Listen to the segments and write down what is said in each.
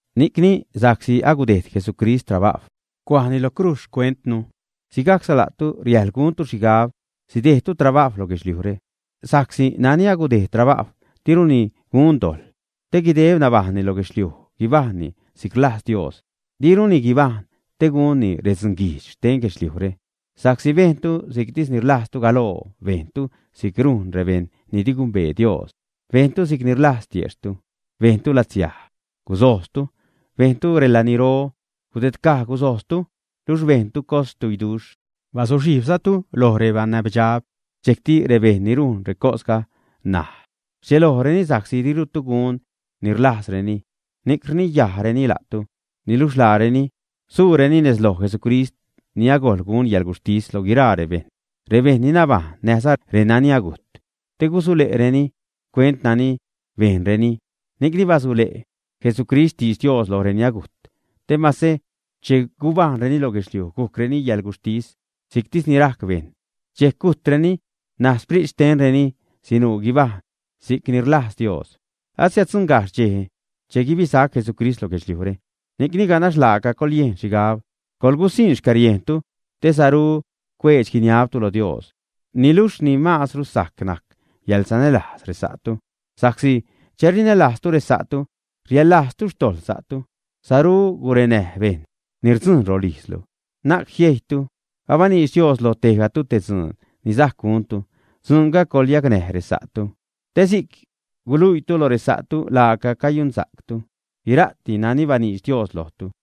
Ni'cni sa'csi agudejd Jesucrist trabajw cuajni lo crujz xcuentnu, sigajcza la'tu riäjḻ guntu xhigab sidejdtu trabajw lo guedxliujre sa'csi nani agudejd trabajw, diruni gun dojḻ, te guideb nabajṉni lo guedxliuj, guibajṉni si'c rlajz Dios, diruni guibajṉ te gunni redzunguijdx xten guedxliujre. Sa'csi bejntu si'ctis ni rlajztu galoo, bejntu si'c rujn rebejṉ ni di gumbee Dios, bejntu si'cni rlajz tiejxhtu, bejntu latsiaj, gusojztu, bejntu relaniro, gudedcaj gusojztu, luxh bejntu cosxtuiduxh bazuxhijbzatu loj rebanäbdxab. Dxejcti rebejṉ ni rujn recosga ṉaj, rdxelojreni sa'csi dirutu gun ni rlajzreni, ni'c rniyajreni la'tu. Niluxh laareni suureni nez loj Jesucrist ni agojḻ gun yäḻguxhtis loj guiraa rebejṉ, rebejṉ ni nabajṉ näjza renani agujt, te gusule'reni xcuent nani bejnreni. Ni'cni basule' Jesucrist xtidx Dios loj reni agujt, te mase che gubajṉreni lo guedxliuj gujcreni yäḻguxhtis si'ctis ni rajc bejṉ, dxejc gujtreni, ṉaj sprit xtenreni sinuu guibajṉ si'c ni rlajz Dios. Asiäddzuṉgajxh dxej che guibisac Jesucrist lo guedxliujre. Ni'cni ganax laaca coḻyejn xhigab, coḻgusiṉ xcäriejntu te saru cuedx-guiniabtu lo Dios. Niluxh ni maazru sajc najc yäḻsanälajz resa'tu sa'csi che rinälajztu resa'tu, riaḻlajztu xtojḻ sa'tu. Saru gurenäj bejṉ ni rdzujn rolijzlu, na'c jiejytu. Abaniidx Dios loj tejgatu te dzuun ni sajc guntu. Dzuunga coḻyacnäj resa'tu, te si'c guluiitu lo resa'tu laaca cayunsa'ctu guira'ti nani baniidx Dios lojtu.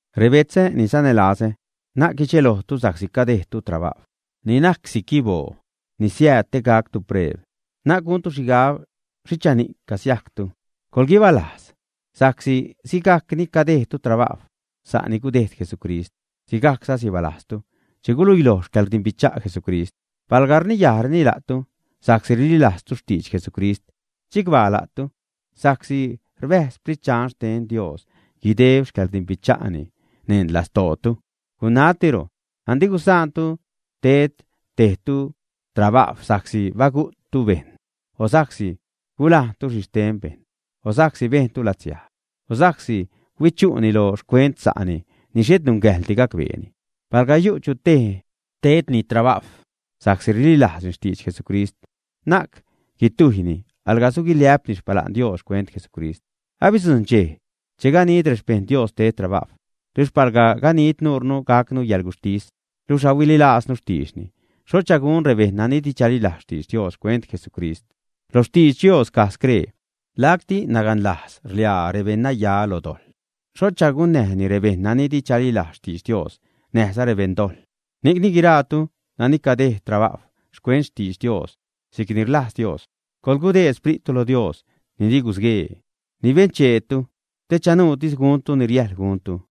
Rebetzä ni sanälazä, na'c guidxelojtu sa'csi cadejdtu trabajw ni najc si'c guiboo, ni siääd te gactu preeb. Na'c guntu xhigab xhichani'c casiajctu. Coḻguibalajz sa'csi sigajc ni cadejdtu trabajw sa'ni gudejd Jesucrist, sigajcza sibalajztu che guiluiloj xcäḻrdimbicha' Jesucrist. Palga rniyajreni la'tu sa'csi rililajztu xtidx Jesucrist, chicbaa la'tu, sa'csi rbäjz Xprit Dxan xten Dios guideb xcäḻrdimbicha'ni neṉ lastootu. Gunatiro, andi gusaantu ted tejtu trabajw sa'csi bagu'ttu bejṉ, o sa'csi gulajntu xhi xten bejṉ, o sa'csi bejntu latsiaj, o sa'csi huichu'ni lo xcuent sa'ni ni xhet nungäjḻdi gacbeeni. Palga yu' chu tej tedni trabajw sa'csi rililajzni xtidx Jesucrist, na'c guitujyni, alga suguiliä'pni xpala'n Dios xcuent Jesucrist. Abidzujṉ dxej che ganid rexpejṉ Dios ted trabajw. Luxh palga ganid nuurnu gacnu yäḻguxhtis luxh ahuililaaznu xtiidxni, ¡xhocha gun rebejṉ nani di chalilajz xtidx Dios xcuent Jesucrist! Lo xtidx Dios caj scree: Lacti naganlajz rḻiaa rebeṉnaya lo dojḻ, ¿xhocha gunäjni rebejṉ nani di chalilajz xtidx Dios näjza rebeṉdojḻ? Ni'cni, guiraatu nani cadejd trabajw xcuent xtidx Dios si'cni rlajz Dios, coḻgudeed xprittu lo Dios ni di gusguee, ni bencheetu, te chanuutis guntu ni riäjḻ guntu.